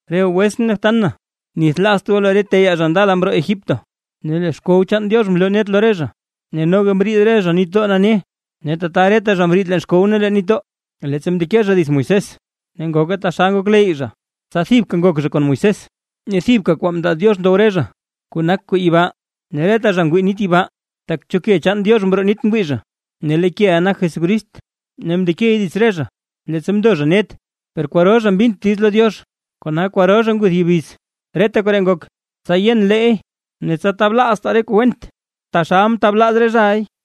Re goo wetsʼn ne btan na, nithlaazt goo lee re teyaa zha ndala mroo Egipto, ne lee xkow chaan Diox mloo net lo re zha, ne noga mriid zha nitdoo nane. Ne tata reta zha mriid leen xkow ne leen nitdoo, leettsa mndeke zha dits Moisés, ne ngoke taxal ngokleyy zha, tsa thibka ngok zha kon Moisés. Ne thibka kwaa mndaa Diox ndow reta zha, kuu nak kuu yibaa, ne reta zha ngwii nit yibaa. Tak cho ke chaan Diox mroo nit ngwii zha. Ne lee keʼa nak Jesucrist ne mndekey dits re zha, leettsa mndo zha net. Per kwaro zha mbint diiz lo Diox, kona kwaro zha nguth yubiz. Reta koree ngok, tsa yen leey ne tsa tablaaztaa re kuu went, taxal mtablaaz re zhaʼay.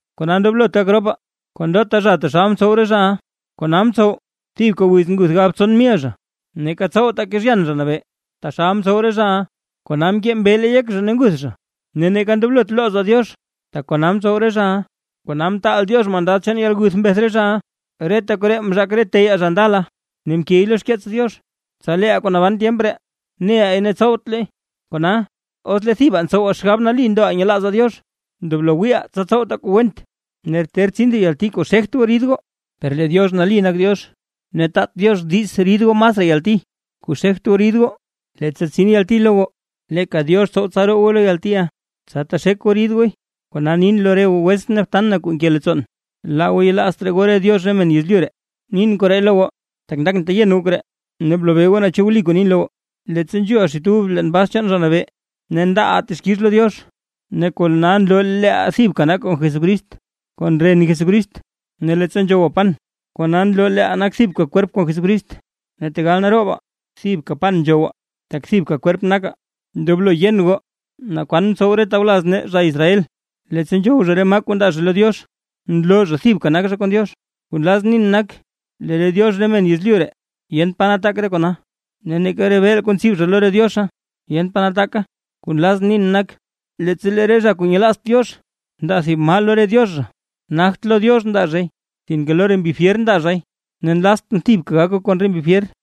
Kona ndoblot gak ropaa kon ndota zha taxal mtsow re zhaʼa. Kona mtsow kona thibka wiz nguth galbtson mil zha. Neeka tsowtaa kezhyan Zha Nabee, taxal mtsow re zhaʼa, kona mkee mbeele yek zha ne nguth zha. Ne neeka ndoblot loozaa Diox, tak kona mtsow re zhaʼa, kona mtaal Diox mandad chaan yalguth mbeth re zhaʼa. Reta koree mzhaak re teyaa zha ndala, ne mkey lo xkeets Diox, tsa leeʼaa kuu naban tyemp ree ne leey ne tsowtleey. Kona, os lee thibaa ntsowaa xgab nali ndoʼaa nyelaazaa Diox, ndoblo wiiʼaa tsa tsowtaa kuu went. Ne ter tsin thib yalti kuu xegt goo rid goo, per lee Diox nali nak Diox ne taat Diox diiz rid goo masraa yalti kuu xegt goo rid goo. Leettsa tsin yalti lo goo, leeka Diox tsow tsa roo goo lo yaltiʼa, tsa texek goo rid gooy. Kona nin lo re goo wetsʼn ne btan na kuu nke leettsoon, laa goo yelaazt raa goo re diox re men yezlyu ree. Nin koree lo goo, tak ndakʼn teyen goo koree, ne blobee goo naa chu wli kuu nin lo goo. Leettsa nzhuuʼaa xit ub leen bas chaan Zha Nabee, ne ndaaʼaa texkix lo Diox, ne kona nloo leeʼaa thibka nakaa kon Jesucrist kon ren Jesucrist; ne leettsa nzhowaa pan, kona nloo leeʼaa nakaa thibka kwerp kon Jesucrist. Ne tegal naroobaa, thibka pan nzhowaa, tak thibka kwerp nakaa. Ndoblo yen goo naa kwaan mtsow re tawlaz nee zha Israel; leettsa nzhow zha re maa kuu ndaa zha lo Diox, nloo zha thibka nak zha kon Diox. Kuu nlazʼn nin nak, lee re diox re men yezlyu ree yent pa nataak re kona, ne neeka re beel kuu ntsib zha lo re diozha yent pa nataaka. Kuu nlazʼn nin nak, leettsa lee re zha kuu nyelaazt Diox ndaa thib maa lo re diox zha, nagt lo Diox ndaa zhay, sinke lo re mbi fyer ndaa zhay, ne nlaztʼn thibka gak goo kon re mbi fyer.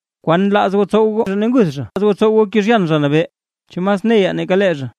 ¿Kwan nlaaz goo tsow goo? ¿Chu nlaaz goo tsow goo kezhyan Zha Nabee? ¿Chu mas neyaa nake lee zha?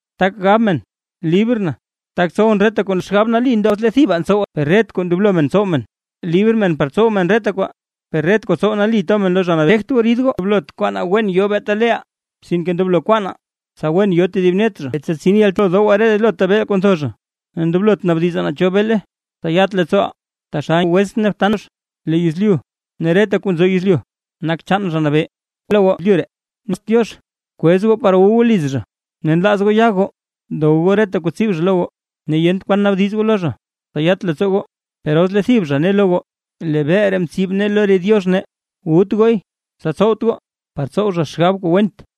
Tak gab men: “Librʼn tak tsowʼn reta kuu nlazʼn”. Wliy, per ret kwaa ndoblo men tsow men. “Libr men par tsow men reta kwaa”, per ret kwaa tsow nali to men lo Zha Nabee. Ndoblot kwaanaa wen yo beeta leeʼaa, sinke ndoblo kwaanaa tsa wen yo tedib net zha. Ndoblo dowaa relota beel kuu ntho zha, ne ndoblot naabdizaa naa cho beele, tsa yat leettsooʼaa. Taxal nke lo xkeets Diox: Lee yezlyu ne reta kuu nzo yezlyu nak chaan Zha Nabee. Os lee thib zha kuu nyelaazt Diox, kwez goo par wu goo liz zha, ne nlaaz goo ya goo, dow goo reta kuu tsib zha lo goo, ne yent kwan naabdiz goo lo zha, tsa yat leettsoo goo. Per os lee thib zha ne lo goo: “Lee beel ree mtsib nee lo re diox nee”, wut gooy, tsa tsowt goo par tsow zha xgab kuu went.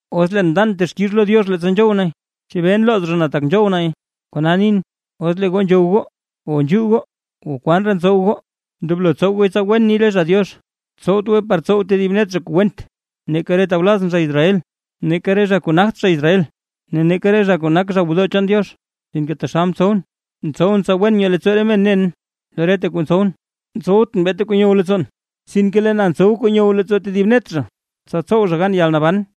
Ne os leen ndan texkix lo Diox leettsa nzhow nay, ¿chebee nlooz zha na, tak nzhow nay?” Kona nin: Os lee goo nzhow goo, o nzhuu goo, o kwan raa ntsow goo, ndoblo tsow gooy tsa wen ni re zha Diox. Tsowt goo par tsow tedib net zha kuu went, neeka re tawlazʼn zha Israel, neeka re zha kuu nagt zha Israel, ne neeka re zha kuu nak zha gwodoo chaan Diozhe. Sinke taxal ntsowʼn, ntsowʼn tsa wen nyoo leettsoo re men nen lo reta kuu ntsowʼn; ntsowt beeta kuu nyow leettsoon, sinke lee na ntsow kuu nyow leettsoo tedib net zha, tsa tsow zha gan yalnaban.